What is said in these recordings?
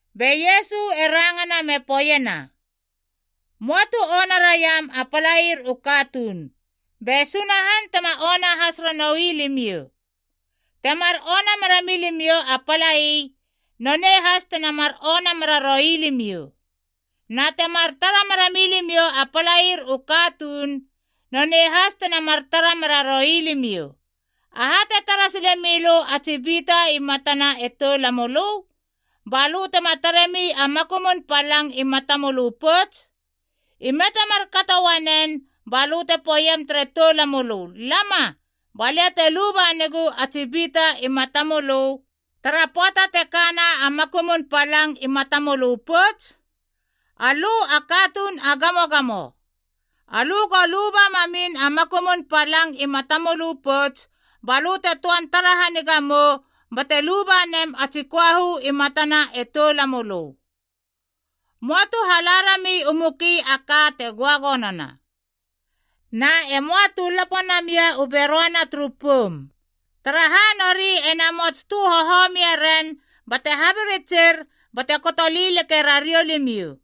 Be Iesu e rangana me poeiena, “Möa tu ona raiam a palair u katuun, be Sunahan tema ona has ranoui limiou. Temar ona mera milimiou a palai, nonei has tena mar ona meraroi limiou. Na temar tara mera milimiou a palair u katuun, nonei has tena mar tara meraroi limiou. Aha te tara sile milö a tsi bita i matana e toulamölö, ba lö tema taremi a makumun palang i matamölö pouts? Ime te markato uanen balö te poeiem tere toulamölö ‘Lama, ba lia te luba negu a tsi bita i matamölö’ tara pöata te kana a makumun palang i matamölö pouts? Alö a katuun a gamogamo, alö go luba mamin a makumun palang i matamölö pouts, ba lö te töan tara haniga mou bate luba nem a tsi köahu i matana e toulamölö. “Möa tu hala rami u muki a ka te göagonona. Na e möa tu lapo namia u beröana turu poum, taraha nori e namots tö hohomie ren bate habiritsir bate koto lileke rariou limiou.”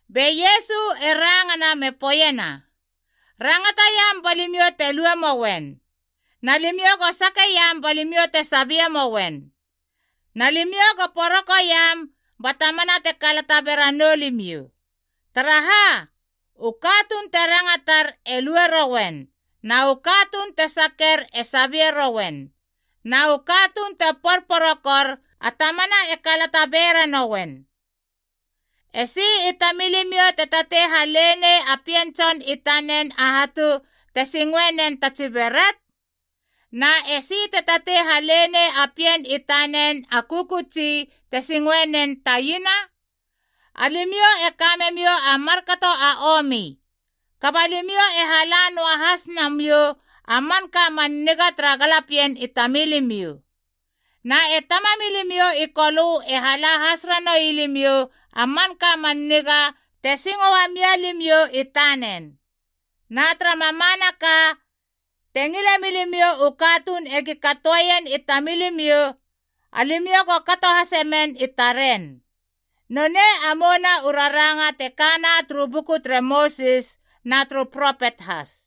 Be Iesu e rangana me poeiena, “Rangataiam ba limiou te lue moen. Na limiou go sakeiam ba limiou te sabie mouen. Na limiou go porokoiam ba tamana te kalata beranou limiou. Taraha, u katuun te rangatar e lue rouen, na u katuun te saker e sabie rouen, na u katuun te porporokor, a tamana e kalata bera nouen. Esi i tamilimiou te tatei hale nei a pien tson i tanen a hatu te singoe nen ta tsi beret? Na esi te tatei hale nei a pien i tanen a kökötsi te singoenen ta iena? Alimiou e ka memiou a markato a omi, kaba limiou e hala noa has namiou a manka man niga tara galapien i tamilimiou. Na e Tamamilimiou i Kolö e hala has ranoui limiou a manka a man niga te singo uamia limiou i tanen. Na tara mamanaka, te ngile milimiou u katuun egi katoeien i tamilimiou, alimiou go kato hasemen i taren. Nonei a mouna u raranga te kana turu buku tere Mosis na turu propet has.”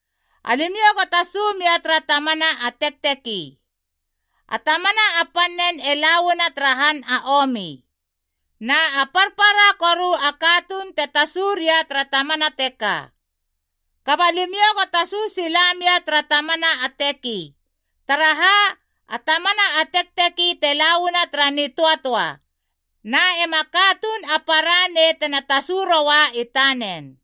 “Alimiou go tasu mia tara tamana a tekteki. A tamana a pannen e la uana tara han a omi, na a parpara koru a katuun te tasu ria tara tamana teka. Kaba limiou go tasu sila mia tara tamana a teki, taraha a tamana a tekteki te la uana tara nitöatöa, na ema katuun a para nei tena tasu roa i tanen.”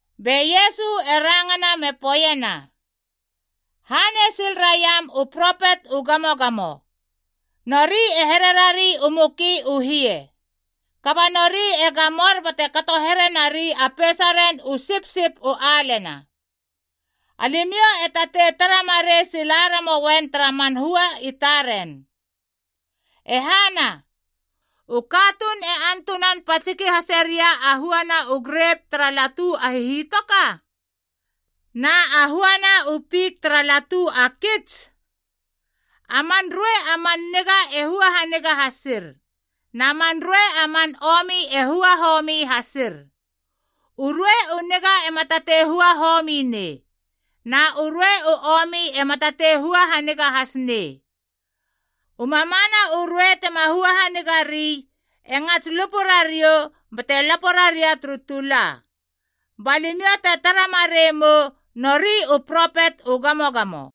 Be Iesu e rangana me poeiena, “Hanei sil raiam u propet u gamogamo. Nori e hererari u muki u hie, kaba nori e gamor bate kato here nari a peisaren u sipsip u alena. Alimiou e tatei tara marei sila ramoien tara man hua i taren. E hana, u katuun e antunan patsiki hase ria a huana u grep tara latu a hihitoka? Na a huana u fik tara latu a kits? A man ruei a man niga e hua haniga hasir, na man ruei a man omi e hua homi hasir. U ruei u niga ema tatei hua homi nei, na u ruei u omi ema tatei hua haniga has nei. U mamana u ruei tema hua haniga ri e ngats lupu rariou bate lapo raria turu tula. Ba limiou te tara marei mou nori u propet u gamogamo.”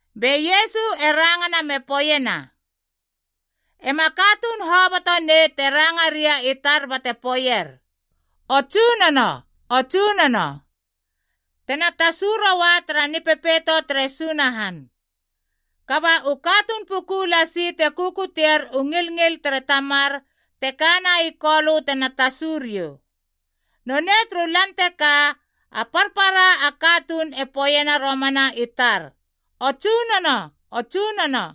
Be Iesu e rangana me poeiena, “Ema katuun hoboto nei te ranga ria i tar bate poeier ‘O Tsunono, O Tsunono,’ tena tasu roa tara Nipepeito tere Sunahan. Kaba u katuun puku lasi te kukuteier u ngilngil tere Tamar te kana i Kolö tena tasu riou. Nonei turu Lan teka, a parpara a katuun e poeiena romana i tar, ‘O Tsunono, o Tsunono.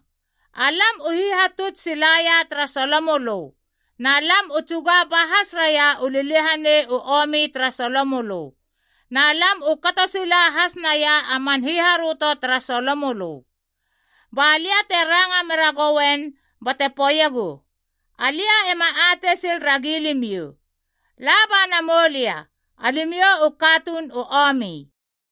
Alam u hihatuts silaia tara solomölö na lam u tsuga ba has raia u liliahanei u omi tara solomölö, na lam u kato sila has naia a man hiharöto tara solomölö.’ Ba lia te ranga meragouen bate poeiegu, ‘Alia ema atei sil ragi limiou. La ba namou lia! Alimiou u katuun u omi.’”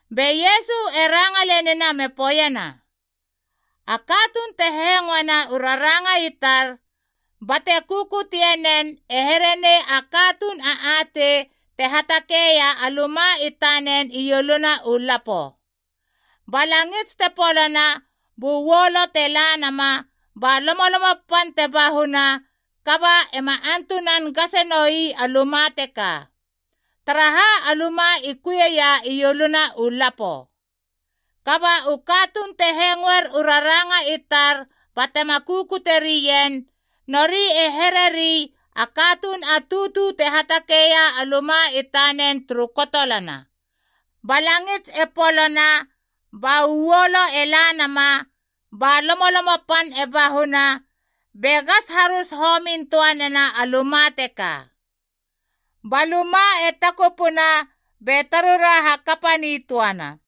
Be Iesu e ranga lenina me poeiena, “A katuun te hengoena u raranga i tar, bate kukutie nen e here nei a katuun a atei te hatakeia a luma i tanen ieluna u lapo. Ba langits te polona bu uolo te la nama, ba lomolomo pan te bahuna, kaba ema antunan gasenoui a luma teka. Taraha a luma i kuieia ioluna u lapo. Kaba u katuun te hengoer u raranga i tar batema kukute rien, nori e hereri a katuun a tutu te hatakeia a luma i tanen turu kotolana. Ba langits e polona ba uolo e la nama, ba lomolomo pan e bahuna, be gas harus homin töa nena a luma teka. Ba luma e takupuna be tarura hakapa nitöana.”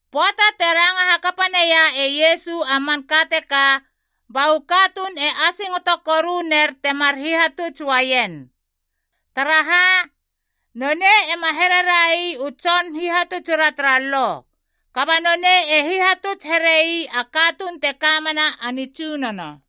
Pöata te ranga hakapanaia e Iesu a manka teka ba u katuun e asingoto koru ner temar hihatuts uaien. Taraha, nonei ema here rai u tson hihatutsura tara Lo, kaba nonei e hihatuts here ii a katuun te kamena a nitsunono.